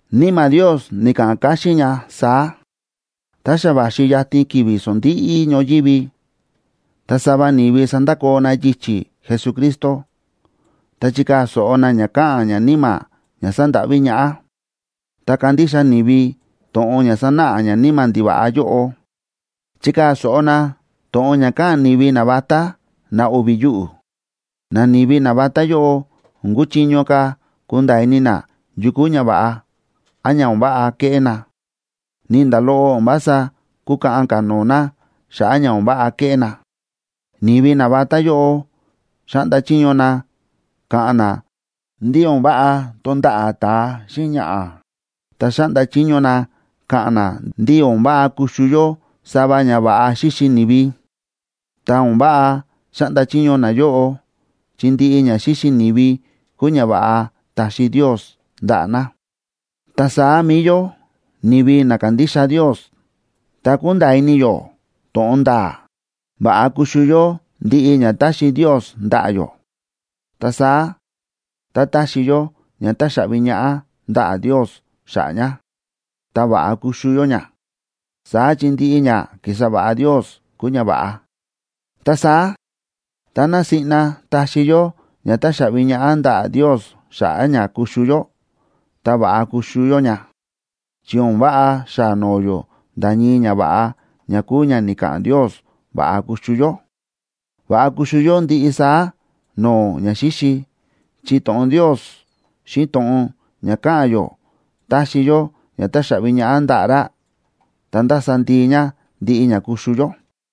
Níma̱ Ndios ni̱ka̱ꞌa̱n káxín ña saá: Tá xa va̱xi yatin ki̱vi̱ sondíꞌí ñoyívi, ta sava ni̱vi sandakoo na yichi̱ Jesucristo, ta chikaa̱ so̱ꞌo na ña káꞌa̱n ñaníma̱ ña sándáꞌví ñaꞌá, ta kandixa ni̱vi to̱ꞌon ña sánáꞌa ñaníma̱ ndiva̱ꞌa yóꞌo. Chikaa̱ so̱ꞌo na to̱ꞌon ña káꞌa̱n ni̱vi navatá, na o̱vi̱ yuꞌu̱. Nani̱vi navatá yóꞌo o̱n kúchiño ka̱ kunda̱a̱ ini na yu kúu ñava̱ꞌa, án ña o̱n váꞌa keꞌé na, ni nda̱ loꞌo o̱n vása kúkaꞌan ka̱ no̱o̱ na xa̱ꞌa̱ ña o̱n váꞌa ke̱ꞌé na. Ni̱vi navatá yóꞌo xáꞌnda chiño na ka̱ꞌa̱n na ndí o̱n váꞌa tonda̱ꞌa̱ ta̱a xíꞌin ñaꞌa̱, ta xáꞌnda chiño na káꞌa̱n na ndí o̱n váꞌa kuxu yó sava ña va̱ꞌa xíxi ni̱vi. Ta o̱n váꞌa xáꞌnda chiño nayóꞌo, chi ndiꞌi ña xíxi ni̱vi kúu ñava̱ꞌa ta̱xi Ndios ndaꞌa̱ na. Ta saá mi̱i yó, ni̱vi na kándixa Ndios, ta kúnda̱a̱ ini yó to̱ꞌon nda̱a̱, va̱ꞌa kuxu yó ndiꞌi ña táxi Ndios ndaꞌa̱ yó. Ta saá tá taxi yó ña táxaꞌvi ñaꞌá ndaꞌa̱ Ndios xa̱ꞌa̱ ña, ta va̱ꞌa kuxu yó ña. Saá chi ndiꞌi ña ki̱sa va̱ꞌa Ndios kúu ña va̱ꞌa. Ta saá táná siꞌna taxi yó ña táxaꞌvi ñaꞌá ndaꞌa̱ Ndios xa̱ꞌa̱ ña kuxu yó, ta va̱ꞌa kuxu yó ña, chi o̱n váꞌa xaa noo yó nda̱ ñii ñava̱ꞌa ña kúu ña ni̱ka̱ꞌa̱n Ndios va̱ꞌa kuxu yó. Va̱ꞌa kuxu yó ndiꞌi saá no̱o̱ ñaxíxi, chi to̱ꞌon Ndios xíꞌin to̱ꞌon ña káꞌa̱n yó táxi yó ña táxaꞌvi ñaꞌá ndaꞌa̱ ra, ta ndása ndii ña ndiꞌi ña kuxu yó.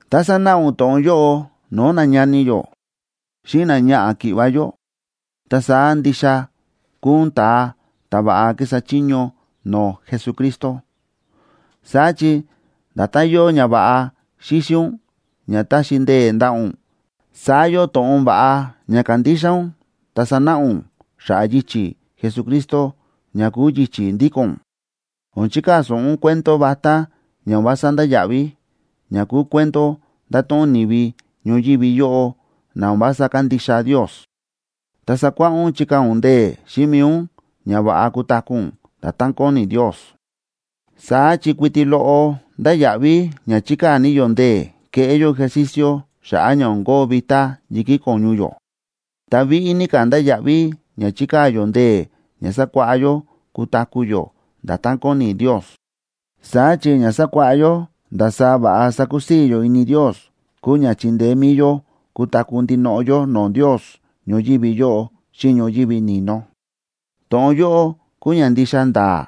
Tá sanáꞌa ún to̱ꞌon yóꞌo no̱o̱ nañani yó xíꞌin náñaꞌa̱ ki̱ꞌva̱ yó, ta saá ndixa kuu ún ta̱a ta̱ va̱ꞌa kísa chiño no̱o̱ Jesucristo. Saá chi nda̱tán yóo ñava̱ꞌa xíxi ún ña táxi ndee̱ ndaꞌa̱ ún, saá yóo to̱ꞌon va̱ꞌa ña kándixa ún ta sánáꞌa ún xa̱ꞌa̱ yichi̱ Jesucristo ña kúu yichi̱ ndíko̱n ún. O̱n chikaa̱ so̱ꞌo ún cuento vatá ña o̱n vása ndáya̱ꞌví, ña kúu cuento ndáto̱ꞌon ni̱vi ñoyívi yóꞌo na o̱n vása kándixa Ndios. Ta sakuáꞌá ún chikaa̱ ún ndee̱ xíꞌin mi̱i ún ña va̱ꞌa kutaku̱ ún nda̱tán kóni Ndios. Saá chi kuiti loꞌo ndáya̱ꞌví ña chikaa̱ ní yó ndee̱ keꞌé yó ejercicio xa̱ꞌa̱ ña o̱n kóo vitá yi̱kí ko̱ñu yó. Ta víꞌí ní ka̱ ndáya̱ꞌví ña chikaa̱ yó ndee̱ ña sakuáꞌá yó kutaku̱ yó nda̱tán kóni Ndios. Saá chi ña sakuáꞌá yó ndasaá va̱ꞌa sakusii̱ yó ini Ndios kúu ña chindeé mi̱i yó kutaku̱ ndinoꞌo yó no̱o̱ Ndios ñoyívi yóꞌo xíꞌin ñoyívi ni̱no. To̱ꞌon yóꞌo kúu ña ndixa nda̱a̱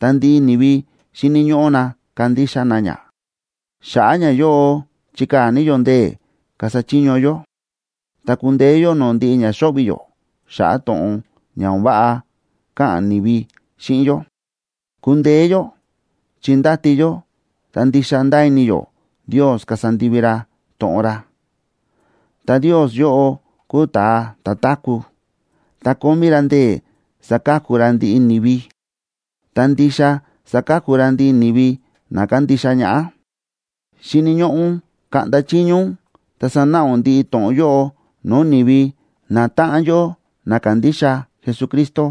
ta ndiꞌi ni̱vi xíni̱ ñóꞌó na kandixa na ña. Xa̱ꞌa̱ ñayóꞌo chíkaa̱ ní yó ndee̱ kasa chiño yó, ta kúndeé yó no̱o̱ ndiꞌi ña xóꞌvi̱ yó xa̱ꞌa̱ to̱ꞌon ña o̱n váꞌa káꞌa̱n ni̱vi xíꞌin yó. Kúndeé yó chi ndáti yó ta ndixa ndáa ini yó Ndios kasa ndivi ra to̱ꞌon ra. Ta Ndios yóꞌo kúu ta̱a ta̱ táku̱, ta kómí ra ndee̱ saka̱ku ra ndiꞌi ni̱vi, ta ndixa saka̱ku ra ndiꞌi ni̱vi na kándixa ñaꞌá. Xíni̱ ñóꞌó ún kaꞌnda chiño ún ta sanáꞌa ún ndiꞌi to̱ꞌon yóꞌo no̱o̱ ni̱vi natáꞌan yó na kándixa Jesucristo.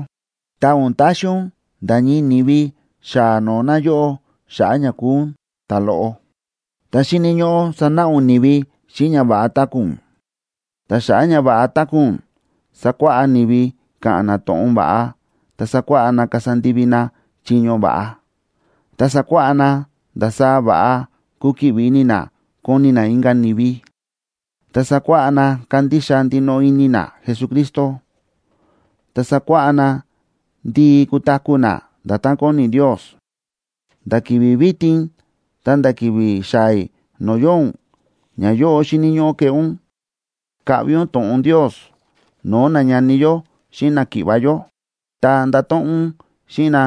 Ta o̱n taxi ún nda̱ ñii ni̱vi xaa noo na yóꞌó xa̱ꞌa̱ ña kúu ún ta̱loꞌo. Ta xíni̱ ñóꞌó sanáꞌa ún ni̱vi xíꞌin ña va̱ꞌa táku̱ ún. Ta xa̱ꞌa̱ ña va̱ꞌa táku̱ ún, sakuáꞌá ni̱vi ka̱ꞌa̱n na to̱ꞌon va̱ꞌa, ta sakuáꞌá na kasa ndivi na chiño va̱ꞌa. Ta sakuáꞌá na ndasaá va̱ꞌa kukiꞌvi ini na koni na inka̱ ni̱vi, ta sakuáꞌá na kandixa ndinoꞌo ini na Jesucristo, ta sakuáꞌá na ndii kutaku̱ na nda̱tán kóni Ndios. Nda̱ ki̱vi̱ vitin ta̱nda̱ ki̱vi̱ xaa̱ i̱ no̱o̱ yóo ún, ñayóꞌo xíni̱ ñóꞌó keꞌé ún: Kaꞌvi ún to̱ꞌon Ndios no̱o̱ nañani yó xíꞌin náki̱ꞌva̱ yó, ta ndato̱ꞌon ún xíꞌin na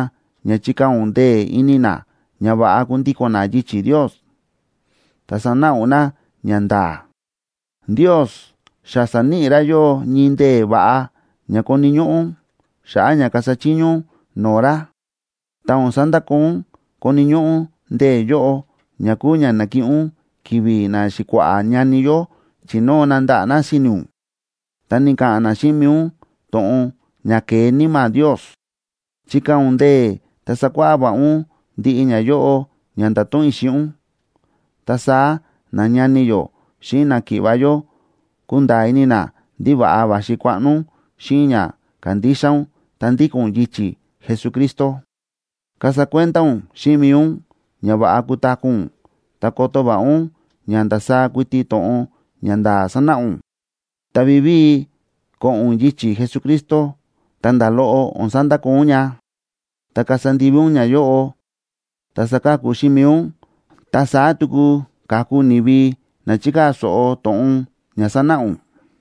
ña chikaa̱ ún ndee̱ ini na ña va̱ꞌa kundíko̱n na yichi̱ Ndios, ta sanáꞌa ún na ñanda̱a̱. Ndios xa sa̱níꞌi ra yóꞌó ñii ndee̱ va̱ꞌa ña koni̱ ñóꞌó ún xa̱ꞌa̱ ña kasa chiño ún no̱o̱ ra, ta o̱n sandakoo ún koni̱ ñóꞌó ún ndee̱ yóꞌo, ña kúu ña na̱kiꞌin ún ki̱vi̱ naxi̱kua̱ꞌa̱ ñani yó chi̱nóo na ndaꞌa̱ na si̱ni̱ ún, ta ni̱ka̱ꞌa̱n na xíꞌin mi̱i ún to̱ꞌon ña ke̱e Níma̱ Ndios. Chikaa̱ ún ndee̱ ta sakuáꞌá va̱ꞌa ún ndiꞌi ñayóꞌo ña ndáto̱ꞌon i̱ xíꞌin ún. Ta saá nañani yó xíꞌin náki̱ꞌva̱ yó kunda̱a̱ ini na ndí va̱ꞌa va̱xi kuaꞌno ún xíꞌin ña kándixa ún ta ndíko̱n ún yichi̱ Jesucristo. Kasa kuenda ún xíꞌin mi̱i ún ña va̱ꞌa kutaku̱ ún, ta koto va̱ꞌa ún ña ndasaá kuiti to̱ꞌon ña nda̱a̱ sanáꞌa ún, ta vivíi ko̱ꞌo̱n ún yichi̱ Jesucristo, ta nda̱ loꞌo o̱n sandakoo ún ña. Tá kasa ndivi ún ñayóꞌo, ta saka̱ku xíꞌin mi̱i ún, ta saá tuku ka̱ku ni̱vi na chikaa̱ so̱ꞌo to̱ꞌon ña sánáꞌa ún.